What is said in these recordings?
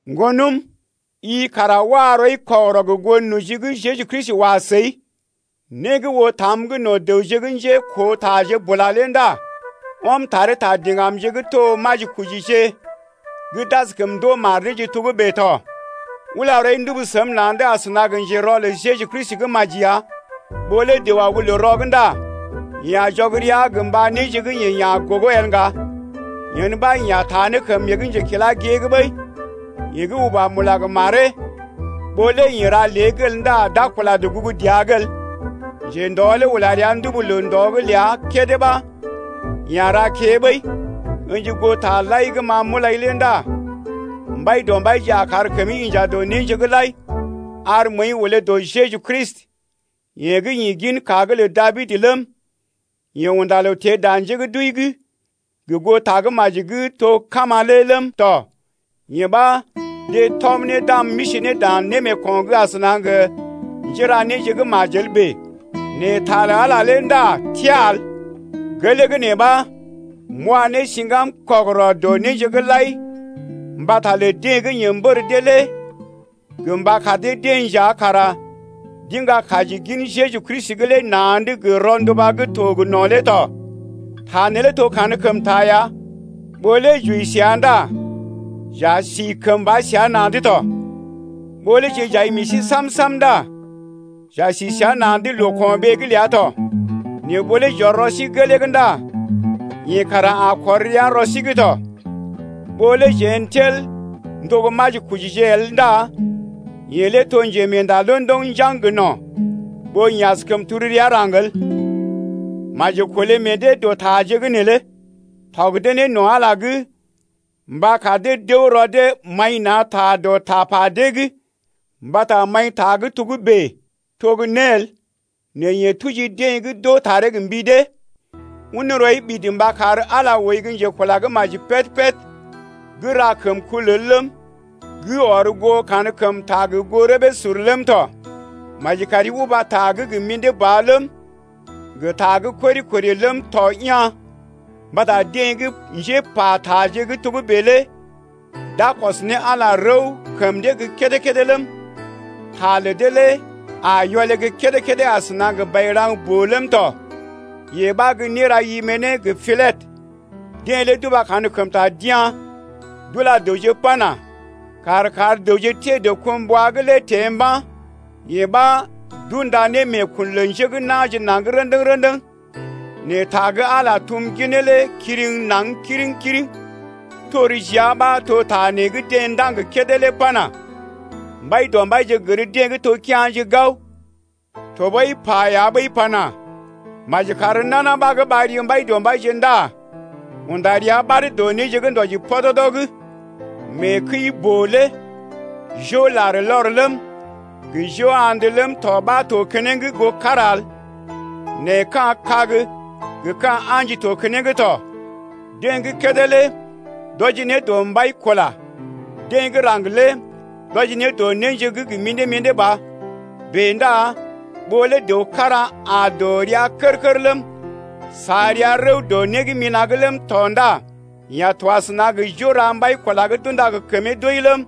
Ŋgonəm, i kara wa rɔi kɔgərɔ gə goo noji gə́ Jeju Kristi wa səi lé. Né gə́ oo tam’g no̰ dəwje gə́ njékootaje bula lé ndá ɔm taree ta diŋgamje gə́ to majikojije gə́ d’askəm ndoo mar deeje togə́bè tɔ. Ula rɔi ndubu səm na̰’d asəna gə njerɔ lə Jeju Kristi gə́ maji ya. Ɓó lé dəw aw gə́ loo rɔ’g ndá yeḛ a jɔg rəa gə mba néje gə́ yeḛ ya̰ gogo el ŋga, yen ɓa yeḛ a taa kəm yeḛ gə́ njekila gée’g ɓəi. Yeḛ gə́ uba mula gə maree, ɓó lé yeḛ ra lée’g el ndá d’a kula dɔgugu dəa’g el. Njendɔ lé ula rəa ndubu loo ndɔ’g ləa kédé ɓa yeḛ ra kée ɓəi. Ǝ̰ji goo taje lai gə́ ma m’ulai lé ndá Mbaidɔmbaije a kar kəmi inja dɔ néje’g lai. Ar məəi olé dɔ Jeju Kristi yeḛ gə́ ḭ ginka’g lə Dabid ləm, yeḛ unda loo teḛ dan njé gə́ d’wəi’g gə goo tagə́maji gə́ to gə́ kama lé ləm tɔ. Yee ɓa, deḛ tɔm ne, d’am m’isi ne dan némeeko̰’g asəna gə njera néje gə́ majel bèe. Nɛ ta lə Ala lé ndá təa el. Gelee gə́ nee ɓa, m’wa ne siŋgam kɔgərɔ dɔ néje’g lai mbata lə deḛ gə́ yeḛ mbər dee lé gə mba kar dee-deḛ nja kara d’iŋga kaji gin Jeju Kristi lé na̰’d gə rɔnduba gə́ to gə no̰ lé tɔ. Ta neelé to kankəmta ya: Ɓó lé j’wəi səa ndá j’a si kəmba səa na̰’d tɔ, Ɓó lé jeḛ j’ai meḛ sí sam-sam Ndá j’a si səa na̰’d loo-ko̰ɓee’g ləa tɔ. Nɛ ɓó lé j’ɔr rɔ sí gelee’g Ndá yeḛ kara a kɔr rəa rɔ sí’g tɔ. Ɓó lé jeḛ n’tel n’to gə́ majikojije el Ndá yeḛ lé to njemeenda londoŋ njaŋg gə no̰ Ɓó yeḛ askəm tel rəa raŋg el. Maji kolé meḛ dee dɔ taje’g neelé, tɔg dee ne no̰ Ala’g mba kar dee d’əw rɔ dee maḭ na̰ ta dɔ tapa dee’g, mbata maḭta gə́ togə́bè to gə́ né el nɛ yee tuji dee gə́ d’oo taree gə mbi dee. Un rɔi ɓidi mba kar Ala ooi gə́ njekula gə́ maji péd-péd gə́ ra kəmkul el ləm, gə́ ɔr goo kankəmta gə goo rəbee sur ləm tɔ. Maji kari uba ta gə́ gə mḭdé ba ləm, gə ta gə́ kori-kori ləm tɔ ya̰ mbata deḛ gə́ njépa taje gə́ togə́bè lé d’a kɔs ne Ala rəw kəm dee gə́ kédé-kédé ləm, ta lə dee lé a yɔlé gə́ kédé-kédé asəna gə bairaŋ-boo ləm tɔ. Yee ɓa gə́ néra Imene gə Pilɛtə. Deḛ lé d’uba kankəmta d’ya̰ d’ula dəwje pana: Kàr kar dəwje teḛ dɔkumbwa’g lé teḛ mba̰. Yee ɓa d’unda ne meekun lə njé gə́ na̰je naŋg rə̰dəŋ-rə̰dəŋ. Nɛ ta gə́ Ala tum ginee lé kiriŋ naŋg kiriŋ-kiriŋ. Tor jia ɓa to ta nee gə́ deḛ ndaŋg kédé lé pana: Mbaidɔmbaije gər dee gə́ to kea̰je gao. Tɔɓəi pa ya ɓəi pana: Maji kar nana ɓa gə́ ɓar ri Mbaidɔmbaije ndá unda rəa ɓad dɔ néje gə́ ndɔji pɔdɔdɔ’g. Mee kəi gə́ boo lé jo larlɔr ləm, gə jo hand ləm tɔ ɓa to keneŋ goo kára el, nɛ ka̰ kag gə ka̰ a̰ji to keneŋ tɔ, deḛ gə́ kédé lé d’wɔji ne dɔ mbai-kula, deḛ gə́ raŋg lé d’wɔji ne dɔ néje gə́ gə mḭdé-mḭdé ba. Bèe ndá ɓó lé dəw kára aa dɔ rəa kər-kər ləm, sa rəa rəw dɔ né gə́ mina̰’g ləm tɔ ndá yeḛ a to asəna gə jo ra mbai-kula gə́ d’unda gə kəmee doi ləm,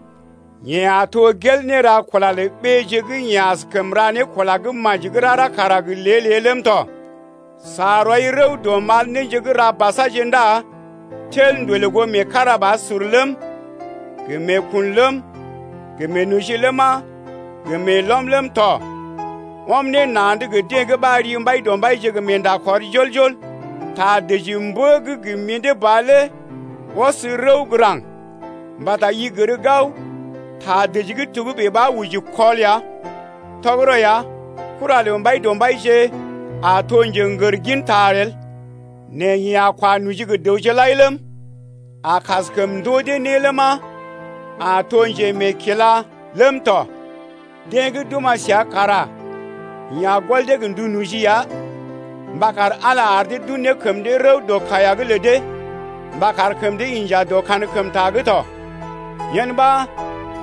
yeḛ a to gel néra kula lə ɓéeje gə́ yeḛ a kaskəm ra ne kula gə́ maji gə́ rara kara gə lée-lée ləm tɔ. Sa rɔi rəw dɔ mal néje gə́ ra basaje ndá tel ndolè goo meekarabasur ləm, gə meekun ləm, gə meenoji ləma, gə meelɔm ləm tɔ, ɔm ne na̰’d gə deḛ gə́ ɓar ri Mbaidɔmbaije gə meenda kɔr jol-jol. Ta dəji mbə gə́ gə mḭdé ba lé ɔs rəw gə́ raŋg mbata i gər gao ta dəji gə́ togə́bè ɓa oji kɔl ya. Tɔgərɔ ya, kura lə Mbaidɔmbaije a to gə́ njḛgər ginta el, nɛ yeḛ a kwa noji gə dəwje lai ləm, a kaskəm ndoo dee né ləma, a to njemeekila ləm tɔ. Deḛ gə́ d’oma̰ səa kara yeḛ a gɔl dee gə ndu noji ya mba kar Ala ar dee d’un ne kəm dee rəw dɔ kaiya’g lə dee mba kar kəm dee inja dɔ kankəmta’g tɔ. Yen ɓa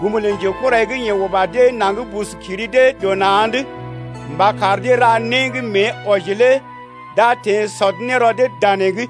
gum lə njekurai gə́ yeḛ uba dee naŋg bus kiri dee dɔ na̰’d mba kar dee ra né gə́ mée wɔji lé d’a teḛ sɔd ne rɔ dee danee’g.